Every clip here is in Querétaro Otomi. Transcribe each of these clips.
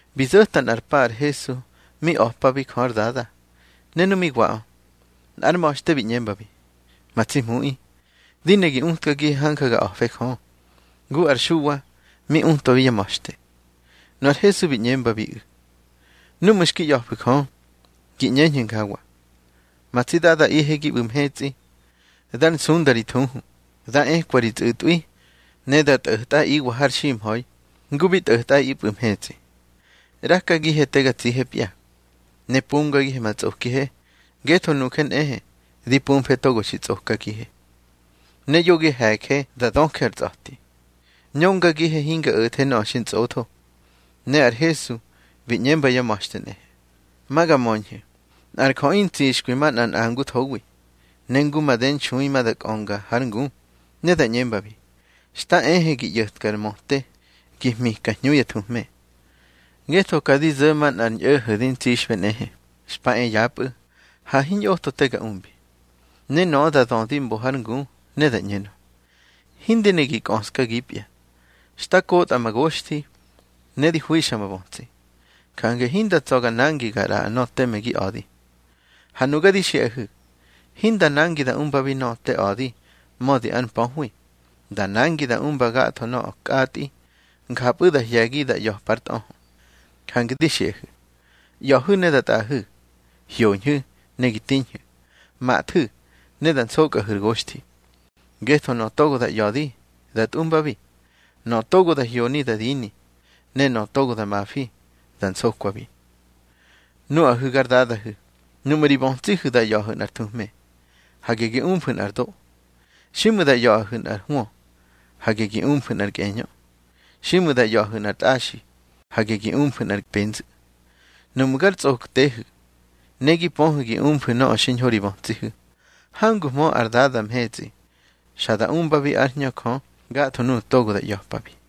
Bi zo̱ta nꞌar pa ar Hesu mi a̱pabi Jö ár Dada, ne nu mi waꞌö, nꞌár ma̱xte bi ꞌñembabi: —Ma tsi Hmuꞌi, di ne gi utkagihe hanja ga a̱fe Jö, ngu ar Xuwa mi utwabi yá ma̱xte. Nu ar Hesu bi ꞌñembabiꞌu̱: —Núꞌmu̱ xki ꞌya̱fu̱ Jö, gi ꞌñeñhu̱ njawa: Ma tsi Dadaꞌihe gi ꞌbu̱ mhetsꞌi, dár nsunda ri thuhu. Dá ekwa ri tsꞌu̱tꞌwi, ne da tꞌo̱tꞌaꞌiwa har ximha̱i ngu bi tꞌo̱tꞌaꞌipꞌu̱ mhetsꞌi. ꞌRakagihe te ga tsihepya. Ne pumgagihe ma tsꞌokihe, ngetho nuje nꞌehe di pumfe togo xi tsꞌokagihe. Ne yo gi he̱je da döje ar tsꞌa̱ti, ñöngagihe hinga o̱the nöꞌö xi ntsꞌotho. Ne ar Hesu bi ꞌñemba yá ma̱xte nꞌehe: —Ma ga möñhu̱, nꞌar jöꞌi ntsixkwi manꞌa nꞌanguthowi. Ne ngu made nxui ma da kꞌönga hár ngu, ne da ꞌñembabi: Xta ehe gi ꞌyo̱tka ar möte gi hmika hñu ya thuhme. Ngetho ka di zo̱ manꞌar ñꞌo̱ho̱ di ntsixꞌbe nꞌehe, xpa e yapꞌu̱, ha hiñꞌotho te ga umbi. Ne nöꞌö da dödi mbo hár ngu, ne da ꞌñenö: Hindi ne gi kꞌöskagipya. Xta kotꞌa ma goxthi, ne di hwixa ma bötsi. Jange hinda tsa̱ ga nangi ga ꞌraꞌa nöꞌö teme gi a̱di. Ha nuga di xiꞌahu̱, hinda nangi da umbabi nöꞌö te a̱di mödi ár mpöhwi. Da nangi da umba gatho nöꞌö kꞌatꞌi, njapꞌu̱ da hye̱gi da ꞌya̱pa ár tꞌöhö. Jange di xiꞌahu̱, ꞌya̱hu̱ ne da tꞌaꞌahu̱. Hyoñhu̱, ne gi tiñhu̱. Mathu̱, ne da nsokꞌahu̱ ar goxthi. Ngetho nöꞌö togo da ꞌya̱di, da tꞌumbabi. Nöꞌö togo da hyoni, da dini. Ne nöꞌö togo da mafi, da nsokwabi. Núꞌahu̱ gar dadahu̱, nuꞌmu̱ ri bötsihu̱ da ꞌya̱ꞌahu̱ nꞌar thuhme, hage gi umfu̱ nꞌar do. Xiꞌmu̱ da ꞌya̱ꞌahu̱ nꞌar hwö, hage gi umfu̱ nꞌar kꞌeñö. Xiꞌmu̱ da ꞌya̱ꞌahu̱ nꞌar tꞌaxi, hage gi umfu̱ nꞌar penzu̱. Nuꞌmu̱ gar tsꞌoktehu̱, ne gi pöhu̱ gi umfu̱ nöꞌö xiñho ri bötsihu̱, hanguhmö ar Dada mhetsꞌi xa da umbabi ár Hñö Jö gatho nuꞌu̱ togo da ꞌya̱pabi.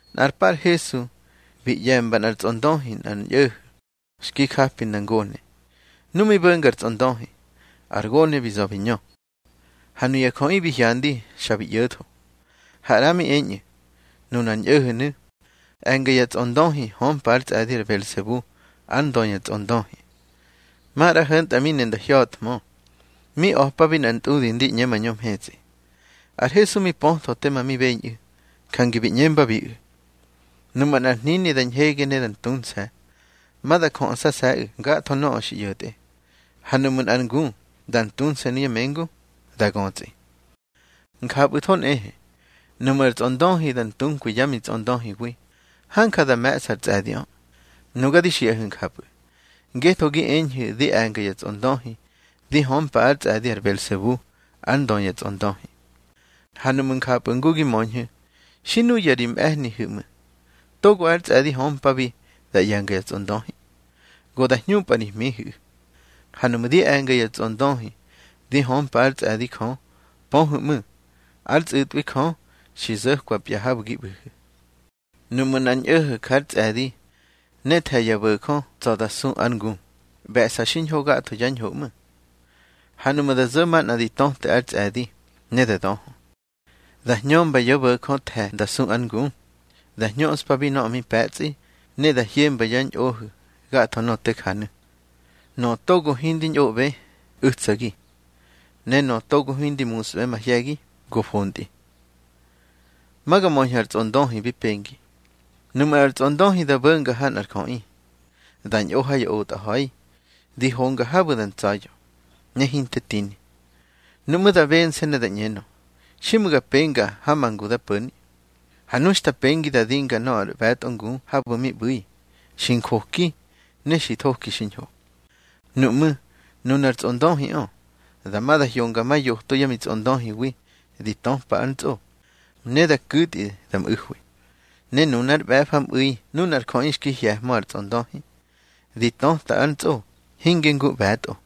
Nꞌar pa ar Hesu bi ꞌye̱mba nꞌar tsꞌondöhi nꞌar ñꞌo̱ho̱ xki japi nda ngone. Nu mi bo̱nga ar tsꞌondöhi, ar gone bi za̱ bi ñö. Ha nuya jöꞌi bi hyandi, xa bi ꞌyo̱tho. Ha ꞌra mi eñꞌu̱: —Nunar ñꞌo̱ho̱nu̱ e̱nga ya tsꞌondöhi, hömpa ár tsꞌe̱di ar Belsebu ár ndö ya tsꞌondöhi. Maꞌra ho̱ntꞌa mi ne nda hya̱thmö, mi a̱pabi nꞌar ntꞌudi ndi ꞌñe mañö mhetsꞌi. Ar Hesu mi pötho tema mi beñꞌu̱, jange bi ꞌñembabiꞌu̱: —Nuꞌmu̱ nꞌar hnini da ñhege ne da ntunse̱, ma da jöꞌsase̱ꞌu̱ gatho nöꞌö xi ꞌyo̱tꞌe. Ha nuꞌmu̱ nꞌar ngu da ntunse̱ nuya mengu, da götsꞌi. Njapꞌu̱tho nꞌehe, nuꞌmu̱ ar tsꞌondöhi da ntunkwi yá mitsꞌondöhiwi, hanja da me̱ꞌsa ár tsꞌe̱diꞌö. Nuga di xiꞌahu̱ njapꞌu̱, ngetho gi eñhu̱ di e̱nga ya tsꞌondöhi di hömpa ár tsꞌe̱di ar Belsebu ár ndö ya tsꞌondöhi. Ha nuꞌmu̱ njapꞌu̱ ngu gi möñhu̱, xi nuya ri mꞌe̱hnihu̱ ꞌmu̱, togo ár tsꞌe̱di hömpabi da ꞌye̱nga ya tsꞌondöhi. Go da hñumpꞌa ri hmihu̱ꞌu̱. Ha nuꞌmu̱ di e̱nga ya tsꞌondöhi di hömpa ár tsꞌe̱di Jö, pöhu̱ ꞌmu̱, ár tsꞌu̱tꞌwi Jö xi zo̱kwapya habu̱ gi ꞌbu̱hu̱. Nuꞌmu̱ nꞌar ñꞌo̱ho̱ jár tsꞌe̱di ne the̱ ya bo̱jö tsa̱ da su ár ngu, ꞌbe̱ꞌsa xiñho gatho yá ñho ꞌmu̱. Ha nuꞌmu̱ da zo̱ manꞌa di töte ár tsꞌe̱di, ne da döhö, da hñömba yá bo̱jö the̱ nda su ár ngu. Da hñöꞌspabi nöꞌö mi pe̱tsꞌi, ne da hyemba yá ñꞌohu̱ gatho nöꞌö te janu̱. Nöꞌö togo hindi ñꞌoꞌbe, u̱tsagi. Ne nöꞌö togo hindi musꞌbe mahye̱gi, go fontꞌi. Nuꞌmu̱ nꞌar tsꞌondöhi da bo̱nga ha nꞌar jöꞌi, da ñꞌo ha ya otꞌa ha̱i, di honga habu̱ da ntsa̱ya̱, ne hinte tini. Nuꞌmú̱ da bense̱ ne da ꞌñenö: Xiꞌmu̱ ga penga ha ma ngu da po̱ni. Ha nu xta pengi da dinga nöꞌö ár ꞌbe̱tꞌo ngu habu̱ mi ꞌbu̱i, xi njoki, ne xi thoki xiñho. Nuꞌmú̱ nunar tsꞌondöhiꞌö, dama da hyonga ma yoto yá mitsꞌondöhiwi di töpa ár ntsꞌo, ne da ku̱tꞌi da mꞌu̱hwi. Ne nunár ꞌbe̱famꞌu̱i nunar jöꞌi xki hye̱hmö ar tsꞌondöhi, di töta ár ntsꞌo, hinge ngu ꞌbe̱tꞌo.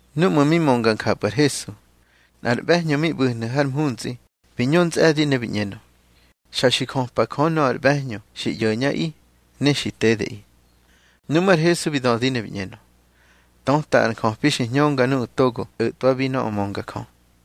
Núꞌmu̱ mi mönga njapꞌu̱ ar Hesu, nꞌar ꞌbe̱hñö mi ꞌbu̱hnu̱ har mhuntsꞌi bi ñö ntsꞌe̱di, ne bi ꞌñenö: —Xa xi jöpa Jö nöꞌö ar ꞌbe̱hñö xi ꞌyo̱ñꞌaꞌi, ne xi tedeꞌi. Nuꞌmú̱ ar Hesu bi dödi ne bi ꞌñenö: —Töta ar njöpi xi hñönga nuꞌu̱ togo o̱twabi nöꞌö mönga Jö.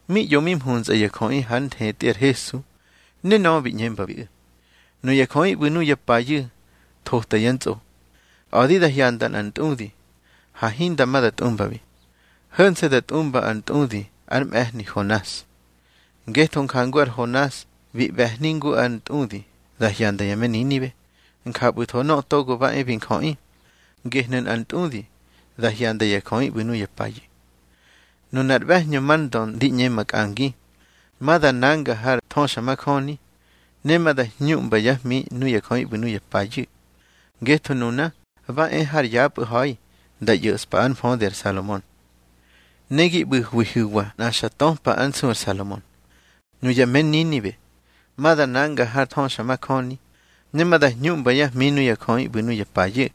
Mi ꞌyo mi mhuntsꞌa ya jöꞌi hár nthetꞌi ar Hesu, ne nöꞌö bi ꞌñembabiꞌu̱: —Nuya jöꞌi ꞌbu̱ nuya payu̱ thota yá ntsꞌo, a̱di da hyanda nꞌar ntꞌudi, ha hinda ma da tꞌumbabi. Ho̱nse̱ da tꞌumba ár ntꞌudi ar mꞌe̱hni Honas. Ngetho njangu ar Honas bi ꞌbe̱hni ngu ar ntꞌudi da hyanda ya me Ninibe, njapꞌu̱tho Nöꞌö Togo ba e bi Njöꞌi, gehnu̱ nꞌar ntꞌudi da hyanda ya jöꞌi ꞌbu̱ nuya payu̱. Nunar ꞌbe̱hñö mar ndö ndi ꞌñe makꞌangi, ma da nanga har thöxamajöni, ne ma da hñuꞌmba yá hmi nuya jöꞌi ꞌbu̱ nuya payu̱. Ngetho nuna ba e har yapꞌu̱ ha̱i nda ꞌyo̱ꞌspa ár mfödi ar Salomon. Ne gi ꞌbu̱hwihu̱wa nꞌa xa töpa ár nsu ar Salomon. Nuya me Ninibe ma da nanga har thöxamajöni, ne ma da hñuꞌmba yá hmi nuya jöꞌi ꞌbu̱ nuya payu̱.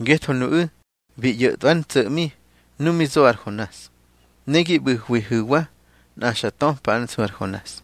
Ngetho nuꞌu̱ bi ꞌyo̱tꞌwa ár ntso̱ꞌmi nu mi zo ar Honas. Ne gi ꞌbu̱hwihu̱wa nꞌa xa töpa ár nsu ar Honas.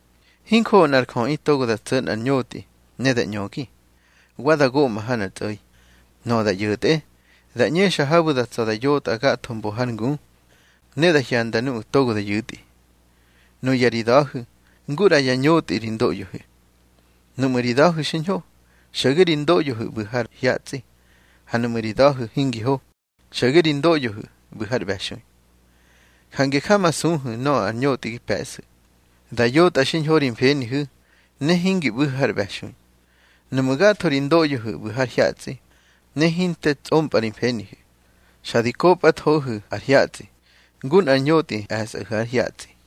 Hinjoꞌo nꞌar jöꞌi togo da tso̱ nꞌar ñotꞌi ne da ꞌñögi, wa da goꞌma ha nꞌar tsꞌo̱i. Nöꞌö da ꞌyo̱tꞌe, da ꞌñexa habu̱ da tsa̱ da yotꞌa gatho mbo har ngu, ne da hyanda nuꞌu̱ togo da yu̱tꞌi. Nuya ri da̱hu̱ ngu ꞌra yá ñotꞌi ri ndoꞌyohu̱. Nuꞌmu̱ ri da̱hu̱ xiñho, xo̱ge ri ndoꞌyohu̱ ꞌbu̱ har hyatsꞌi. Ha nuꞌmu̱ ri da̱hu̱ hingi ho, xo̱ge ri ndoꞌyohu̱ ꞌbu̱ har ꞌbe̱xui. Jange jamasuhu̱ nöꞌö ar ñotꞌi gi pe̱ꞌsu̱, da yotꞌa xiñho ri mfenihu̱, ne hingi ꞌbu̱hu̱ har ꞌbe̱xui. Nuꞌmu̱ gatho ri ndoꞌyohu̱ ꞌbu̱ har hyatsꞌi, ne hinte tsꞌompꞌa ri mfenihu̱, xa di kopꞌathohu̱ ar hyatsꞌi, ngu nꞌar ñotꞌi e̱sꞌahu̱ ár hyatsꞌi.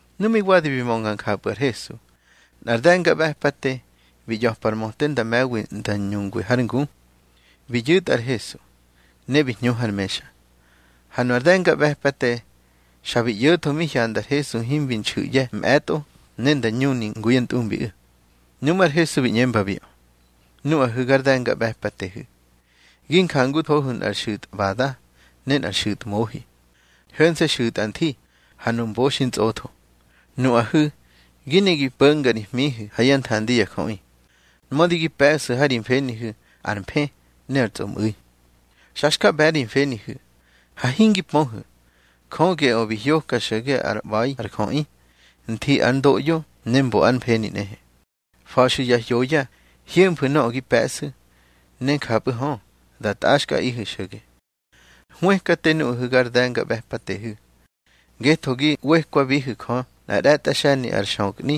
Nu mi wadi bi mönga njapꞌu̱ ar Hesu, nꞌar de̱ngaꞌbe̱pate bi ꞌya̱par möte nda me̱wi nda ñungwi hár ngu. Bi yu̱tꞌa ar Hesu, ne bi hñu har mexa. Ha nu ar de̱ngaꞌbe̱pate xa bi ꞌyo̱tho mi hyanda ar Hesu himbi nxu̱ꞌye̱ mꞌe̱tꞌo ne nda ñuni ngu yá ntꞌumbiꞌu̱. Nuꞌmú̱ ar Hesu bi ꞌñembabiꞌö: —Nuꞌahu̱ gar de̱ngaꞌbe̱patehu̱, gi njanguhu̱ nꞌar xu̱tꞌbada ne ar xu̱tmohi, ho̱nse̱ xu̱tꞌa nthi, ha nu mbo xi ntsꞌotho. Nuꞌahu̱ gi ne gi po̱nga ri hmihu̱ ha yá nthandi ya jöꞌi, mödi gi pe̱ꞌsu̱ ha ri mfenihu̱ ar mfë ne ar tsꞌomꞌu̱i. Xa xka ꞌbe̱ ri mfenihu̱. Ha hingi pöhu̱, Jö geꞌö bi hyoka xo̱ge ár ꞌba̱i ar jöꞌi, nthi ár ndoꞌyo ne mbo ár mfeni nꞌehe. Fa̱xu̱ ya hyoya hyemfu̱ nöꞌö gi pe̱ꞌsu̱, ne njapꞌu̱ hö, da ntꞌaxkꞌaꞌihu̱ xo̱ge. Hwëkate nuꞌahu̱ gar de̱ngaꞌbe̱patehu̱. Ngetho gi ꞌwekwabihu̱ Jö nꞌa ꞌre̱tꞌa xe̱ni ar xökꞌni,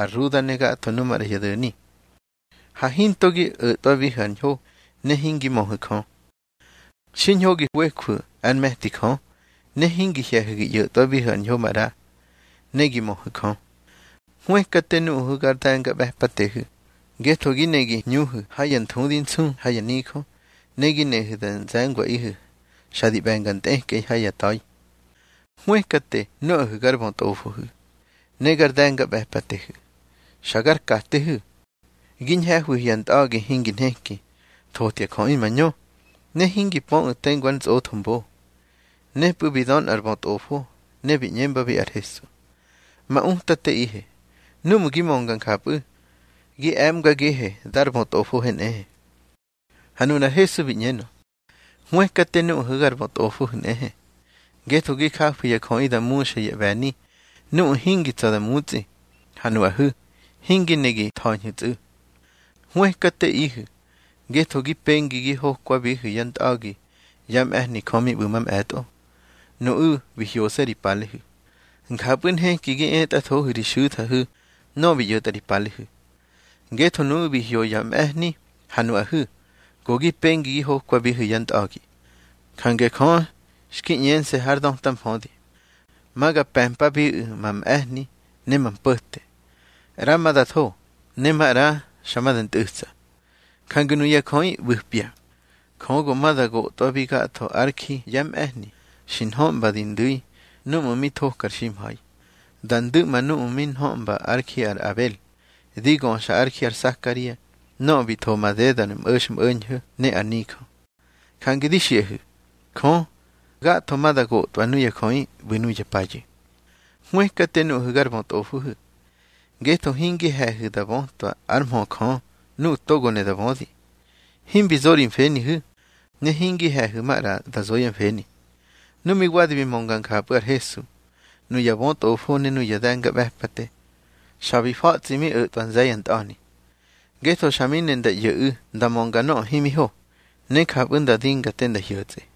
ar ruda ne gatho nu maꞌra ya do̱ni. Ha hinto gi o̱tꞌwabihu̱ ar ñho, ne hingi möhu̱ Jö. Xiñho gi ꞌwejwu̱ ár me̱ti Jö, ne hingi hye̱hu̱ gi ꞌyo̱tꞌwabihu̱ ar ñho maꞌra, ne gi möhu̱ Jö. Hwëkate nuꞌahu̱ gar de̱ngaꞌbe̱patehu̱. Ngetho gi ne gi hñuhu̱ ha ya nthudi nsu ha ya nijö, ne gi nehu̱ da nze̱ngwaꞌihu̱ xa di ꞌbe̱nga ntꞌekꞌei ha ya ta̱i. Hwëkate nuꞌahu̱ gar bötꞌofohu̱, ne gar de̱ngaꞌbe̱patehu̱, xa gar katehu̱. Gi ñhe̱hwihu̱ ya ntꞌa̱gi hingi nheki, thotya jöꞌi mañö, ne hingi pöꞌu̱ tengu ar ntsꞌotho mbo. Nepꞌu̱ bi dö nꞌar bötꞌofo, ne bi ꞌñembabi ar Hesu: —Ma Utateꞌihe, núꞌmu̱ gi mönga njapꞌu̱, gi e̱mgagihe dar bötꞌofohe nꞌehe. Ha nunar Hesu bi ꞌñenö: —Hwëkate nuꞌahu̱ gar bötꞌofohu̱ nꞌehe. Ngetho gi jafu̱ ya jöꞌi da muxa ya ꞌbe̱ni nuꞌu̱ hingi tsa̱ da mutsꞌi, ha nuꞌahu̱ hingi ne gi tha̱ñhu̱tsꞌu̱. Hwëkateꞌihu̱. Ngetho gi pengi gi hokwabihu̱ yá ntꞌa̱gi yá mꞌe̱hni Jö mi ꞌbu̱ mamꞌe̱tꞌo, nuꞌu̱ bi hyose̱ ri palehu̱. Njapꞌu̱ nheki gi etꞌathohu̱ ri xu̱thahu̱ nöꞌö bi ꞌyo̱tꞌa ri palehu̱. Ngetho nuꞌu̱ bi hyo ya mꞌe̱hni, ha nuꞌahu̱ go gi pengi gi hokwabihu̱ yá ntꞌa̱gi. Jange Jö xki ꞌñense̱ hár döta mfödi: Ma ga pe̱mpabiꞌu̱ ma mꞌe̱hni ne ma mpo̱te. ꞌRa ma da tho, ne maꞌra xa ma da ntꞌu̱tsa. Jange nuya jöꞌi ꞌbu̱pya, Jö go ma da gotꞌwabi gatho ár ji yá mꞌe̱hni xi nhöꞌmba di ndu̱i núꞌmu̱ mi thoka ar ximha̱i. Da ndu̱ꞌma núꞌmu̱ mi nhöꞌmba ár ji ar Abel, di göxa ár ji ar Sakaria nöꞌö bi tho madedar mꞌo̱xmꞌo̱ñho̱ ne ar nijö. Jange di xiꞌahu̱, Jö gatho ma da gotꞌwa nuya jöꞌi ꞌbu̱ nuya payu̱. Hwëkate nuꞌahu̱ gar bötꞌofohu̱. Ngetho hingi he̱hu̱ da bötwa ár mhö Jö nuꞌu̱ togo ne da bödi. Himbi zo ri mfenihu̱, ne hingi he̱hu̱ maꞌra nda zo yá mfeni. Nu mi wadi bi mönga njapꞌu̱ ar Hesu, nuya bötꞌofo ne nuya de̱ngaꞌbe̱pate, xa bi fa̱tsꞌi mi o̱tꞌwa nze̱ ya ntꞌa̱ni. Ngetho xa mi ne nda ꞌyo̱ꞌu̱ nda mönga nöꞌö himi ho, ne njapꞌu̱ nda dinga te nda hyo̱tsꞌe.